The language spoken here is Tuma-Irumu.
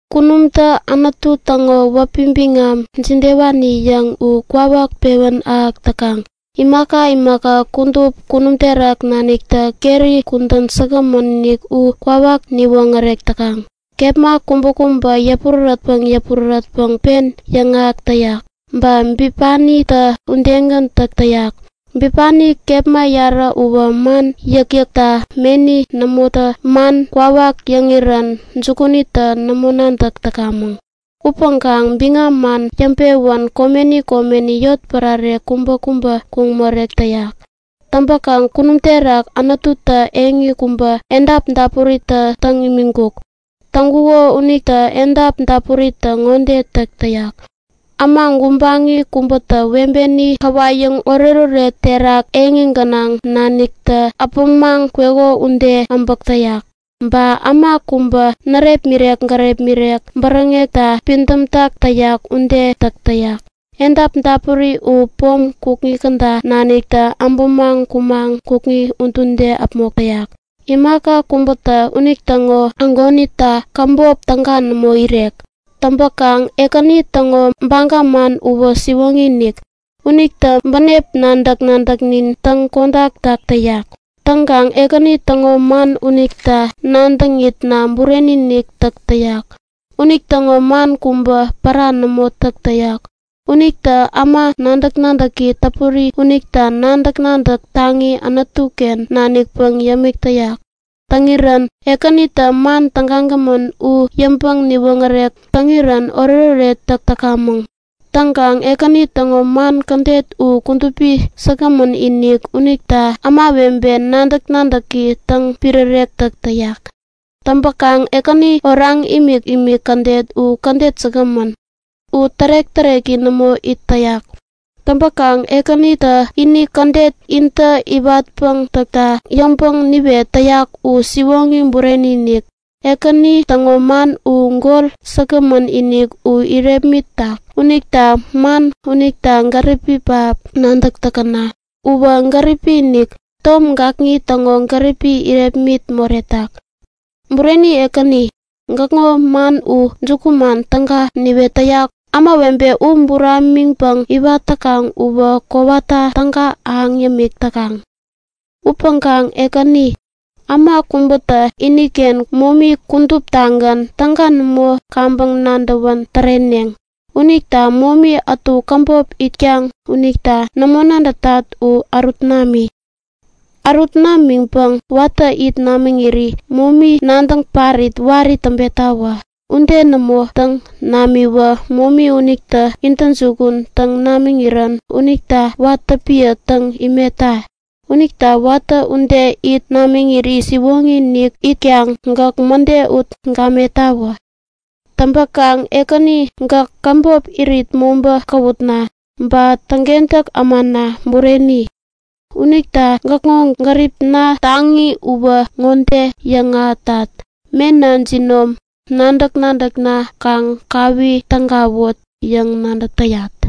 Kunumtä Anutu täŋo wäpi biŋam jidewani yäŋ u kwawak pewän ahäk täkaŋ! Imaka imaka kudup kunum terak naniktä keri kudän säkgämän-inik u kwawak niwoŋärek täkaŋ! Kepma kubäkubätä yäpurärätpäŋ yäpurärätpäŋ pen yäŋahäk täyak. Ba bipanitä udegän täk täyak. Bipani kepma yarä uwä man yäkyäkta meni nämotä man kwawak yäŋirän jukunintä nämo nadäk täkamäŋ. Upäŋkaŋ biŋam man yäŋpewän komeni komeni, yotpärare kubäkubä kuŋ morek täyak. Täŋpäkaŋ kunum terak Anututä eŋi kubä edap dapurita täŋ imiŋkuk. Täŋkuko unita edap dapuritä ŋode täk täyak; Äma gubaŋi kubätä webeni käwayäŋ oretoret terak eŋi gänaŋ naniktä äpämaŋ kweko ude abäk täyak. Ba äma kubä närepmirek gärepmirek-ken bäräŋekta pidämtak täyak ude täk täyak. Edap dapuri u pom kukŋi käda naniktä abämaŋ kumaŋ kukŋi udude äpmok täyak. Imaka kubätä unitäŋo ägonita käbop täga nämo irek. Täŋpäkaŋ Ekäni täŋo baga man uwä siwoŋi-inik. Unitä bänep nadäk-nadäknin täŋ-kodaktak täyak. Täŋkaŋ Ekäni täŋo man unita nadäŋitna bureni-inik täk täyak. Unitäŋo man kubä pära nämo täk täyak. Unitä äma nadäk-nadäki täpuri unita nadäk-nadäk taŋi Anutuken nanikpäŋ yämik täyak. Täŋirän Ekänitä man tägagämän u yäŋpäŋ niwoŋärek täŋirän oretoret täk täkamäŋ. Täŋkaŋ Ekäni täŋo man kädet u kudupi säkgämän-inik unita ämawebe nadäk-nadäki täŋpirärek tak täyak. Täŋpäkaŋ Ekäni oraŋ imikimik kädet u kädet säkgämän. U tärek-täreki nämo it täyak. Täŋpäŋ Ekänitä ini kädet nintä iwatpäŋ täkta yäŋpäŋ niwet täyak u siwoŋi bureni-inik. Ekäni täŋo man u gol säkgämän-inik u irepmitak unita man unita gäripi pähap nadäk täkäna! Uwä gäripi-inik, tom gakŋi täŋo gäripini irepmit moretak. Bureni Ekäni, gäkŋo man u jukuman täga niwet täyak. Ämawebe u buramiŋpäŋ iwat täkaŋ uwä kowata täga ahäŋ yämik täkaŋ. Upäŋkaŋ Ekäni, äma kubätä iniken momi kuduptagän täga nämo kaŋpäŋ nadäwän täreneŋ. Unita momi ätu käbop itkaŋ unita nämo nadätat u ärut nami! Ärut namiŋpäŋ watä it namiŋiri momi nadäŋ parit wari täŋpetawä! Ude nämo täŋ namiwä momi unitä intäjukun täŋ namiŋirän unita watä piä täŋ imetta! Unita watä ude it namiŋiri siwoŋi-inik itkaŋ gäk mäde ut gamettawä. Täŋpäkaŋ Ekäni gäk käbop irit mobä käwutna, ba täŋkentäk ämana bureni! Unita näkŋo gäripna taŋi uwä ŋode yäŋahätat; Mena jinom, nadäk-nadäkna kaŋ kawi tägawut yäŋ nadäk täyat.